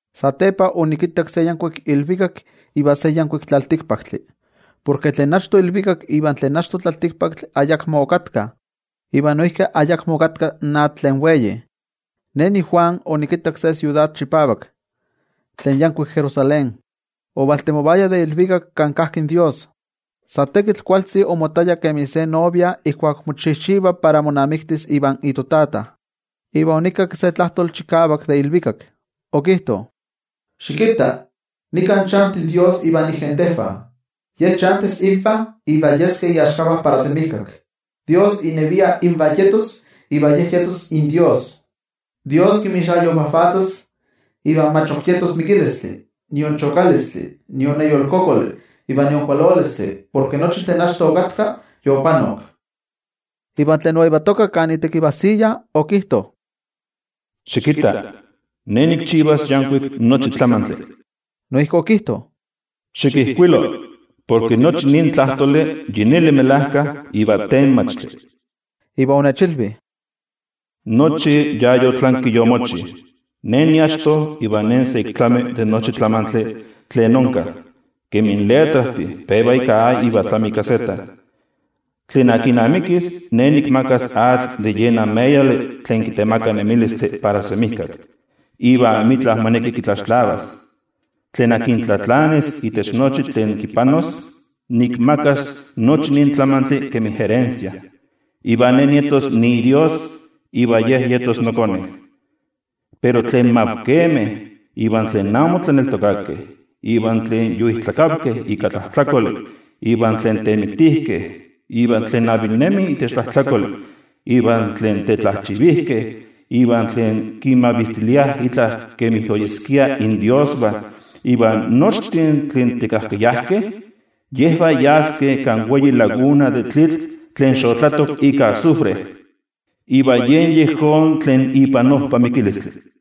Satepa onikittak se yankuik ilvikak iva se yankuik tlaltikpaktli. Porke tlen achto ilvikak iva tlen achto tlaltikpaktli ayakmo okatkah, iva noijki ayakmo okatka in atl tlen wei. Ne niJuan, onikittak se siudad chipavak, tlen yankuik Jerusalén, ovaltemovaya de ilvikak kan kajki in toYejwatzi. Sa tekitl kualtzi omottaya kemi se novia ijkuak mochijchiva para monamiktis ivan itotata. Iva onikakki se tlajtoli chikavak de ilvikak. Okijto: —Xikitta. Nika chanti in Dios ivan igentejvah. Ye chantis invah iva yeskeh iaxkavah para semijkak. Dios inevia invah yetos iva Ye yetos inDios. Dios kinmixayovajvatzas, iva mach ok yetos mikilistli, nion chokalistli, nion neyolkokoli, iva nion kualolistli, porke nochi tlen achto okatka, yopanok. Iva tlen oyetoka kan itekivajsiya, okijto: —Xikitta. Ne nikchivas yankuik nochi tlamantli. Noijki okijto: —Xikijkuilo, porke nochi nin tlajtoli yi neli melajka iva tenmachtli. Iva onechilvi: —Nochi ya yotlanki yomochi. Ne niachto iva Ne sa ik nitlami de nochi tlamantli tlen onka, kemi in letrajtih peva ika A iva tlami ika Z. Tlen amikis, Ne nikmakas atl de yen ameyali tlen kitemaka nemilistli para semijkak, iva amitla moneki kitlaxtlavas. Tlen tlatlanis itech nochi tlen kipanos, nikmakas nochi nin tlamantli kemi erensia. Iva Ne nietos niiDios iva ye yetos nokone. Pero tlen mavkemeh, iva tlen amo tlaneltokakeh, iva tlen yoijtlakavkeh ika tlajtlakoli, iva tlen temiktijkeh, iva tlen avilnemi itech tlajtlakoli, iva tlen tetlajchivijkeh, iva tlen kinmavistiliah itla kemi oyeskia indiosvah iva nochtin tlen tekajkayajkeh, yejvah yaskeh kan wei laguna de tlitl tlen xotlatok ika azufre, iva yen yejón tlen ipan ojpa mikilistli.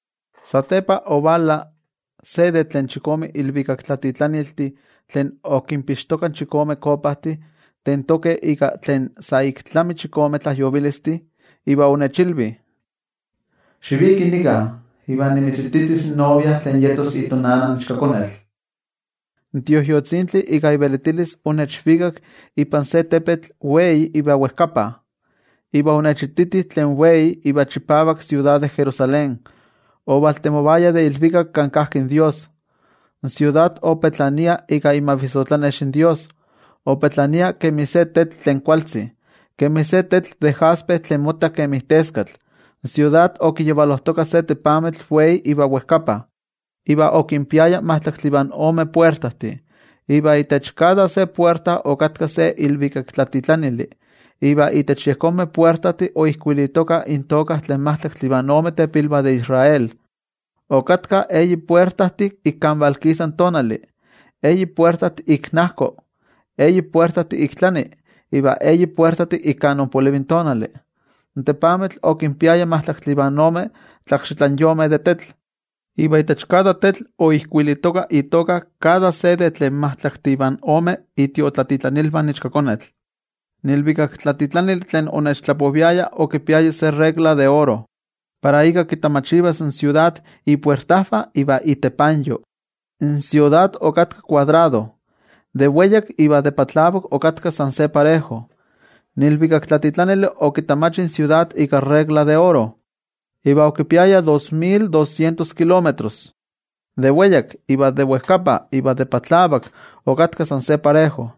Satepa ovala se de tlen chikome ilvikaktlatitlaniltih tlen okinpixtokah chikome kopajtih tentokeh ika tlen sa ik tlami chikome tlajyovilistih. Iva onechilvi: —Xiviki nika, iva nimitzititis in novia tlen yetos itonana in Ichkakonetl. In Tioijyotzintli ika ivelitilis onechvikak ipan se tepetl wei iva wejkapa, iva onechititi tlen wei iva chipavak siudad de Jerusalén, ovaltemovaya de ilvikak kan kajki in toYejwatzi. In siudad opetlania ika imavissotlanex in toYejwatzi. Opetlania kemi se tetl tlen kualtzi, kemi se tetl de jaspe tlen motta kemi teskatl. In siudad okiyavalojtoka se tepamitl wei iva wejkapa, iva okinpiaya majtlaktli ivan ome puertajtih, iva itech kada puerta okatka se ilvikaktlatitlanili. Iva itech yejonmeh puertajtih oijkuilitoka intoka tlen majtlaktli ivan ome tepilvah de Israel. Okatkah eyi puertajtih ik kan valkisa tonali, eyi puertajtih ik najko, eyi puertajtih ik tlani iva eyi puertajtih ik kan ompolivi tonali. In tepamitl okinpiaya majtlaktli ivan ome tlakxitlanyomeh de tetl, iva itech kada tetl oijkuilitoka itoka kada se de tlen majtlaktih ivan omeh itiotlatitlanilvah in Ichkakonetl. In ilvikaktlatitlanili tlen onechtlapoviaya okipiaya se regla de oro, para ika kitamachivas in siudad, ipuertajvah iva itepanyo. In siudad okatka kuadrado. De weyak iva de patlavak okatka san se parejo. In ilvikaktlatitlanili okitamachi in siudad ika iregla de oro, iva okipiaya dos mil doscientos kilómetros. De weyak iva de wejkapa iva de patlavak okatkah san se parejo.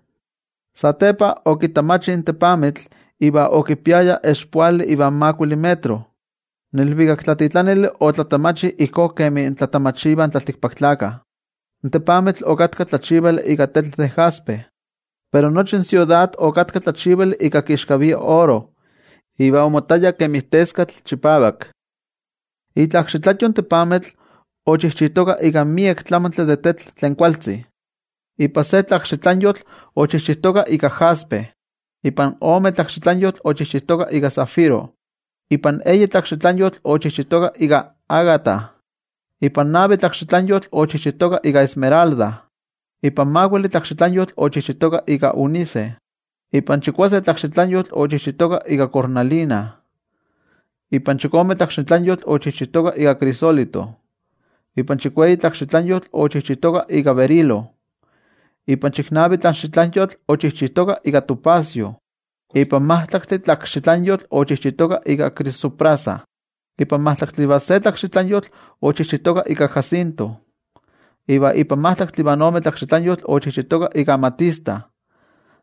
Satepa okitamachi in tepamitl, iva okipiaya expoali ivan makuili metro. In ilvikaktlatitlanili otlatamachi ijkó kemi tlatamachivah in tlaltikpaktlakah. In tepamitl okatka tlachivali ika tetl de jaspe, pero nochi in siudad okatka tlachivali ika kixkavia oro iva omottaya kemi teskatl chipavak. Itlakxitlanyo in tepamitl ochijchitoka ika miek tlamantli de tetl tlen kualtzi. Ipan se tlakxitlanyotl ochijchitoka ika jaspe, ipan ome tlakxitlanyotl ochijchitoka ika zafiro, ipan eyi tlakxitlanyotl ochijchitoka ika ágata, ipan navi tlakxitlanyotl ochijchitoka ika esmeralda, ipan makuili tlakxitlanyotl ochijchitoka ika ónice, ipan chikuase tlakxitlanyotl ochijchitoka ika cornalina, ipan chikome tlakxitlanyotl ochijchitoka ika crisólito, ipan chikueyi tlakxitlanyotl ochijchitoka ika berilo, ipan chiknavi tlakxitlanyotl ochijchitoka ika topacio, ipan majtlaktli tlakxitlanyotl ochijchitoka ika crisoprasa, ipan majtlaktli ivan se tlakxitlanyotl ochijchitoka ika jacinto, iva ipan majtlaktli ivan ome tlakxitlanyotl ochijchitoka ika amatista.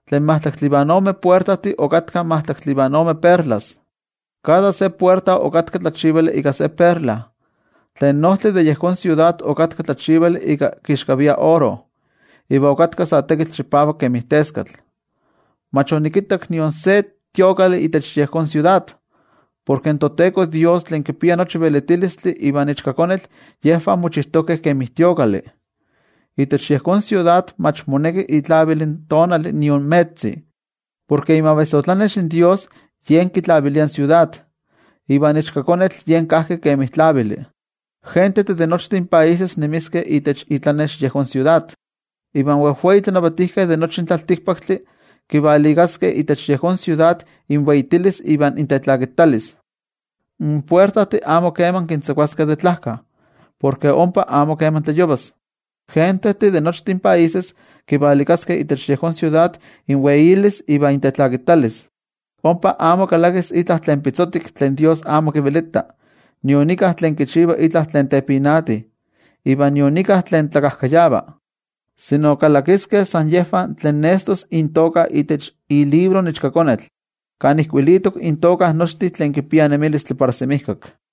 Tlen majtlaktli ivan ome puertajtih okatkah majtlaktli ivan ome perlas. Kada se puerta okatka tlachivali ika se perla. Tlen ojtli de yejón siudad okatka tlachivali ika kixkavia oro, iva okatka sa tekitl chipavak kemi teskatl. Mach onikittak nion se templo itech yejón siudad, porke in toTeko Dios tlen kipia nochi velitilistli ivan Ichkakonetl, yejvah mochijtokeh kemi templo. Itech yejón siudad mach moneki itlavil in tonali nion metzi, porke imavissotlanex in toYejwatzi yen kitlavilia in siudad, ivan Ichkakonetl yen kajki kemi tlavili. In gentejtih de nochtin países nemiskeh itech itlanex yejón siudad. Iva in wejwei tlanavatijkeh de nochi in tlaltikpaktli kivalikaskeh itech yejón siudad inweitilis iva intetlakitalis. In puertajtih amo keman kintzakuaskeh de tlajka, porke ompa amo keman tlayovas. In gentejtih de nochtin países kivalikaskeh itech yejón siudad inweitilis iva intetlakitalis. Ompa amo kalakis itla tlen pitzotik tlen toYejwatzi amo kivelita, nion íkka tlen kichiva itla tlen tepinati iva nion íkka tlen tlakajkayava. Kalakiskeh san yejvah tlen nestos intoka itech ilibro in Ichkakonetl, kan ijkuilitok intoka nochtin tlen kipiah nemilistli para semijkak.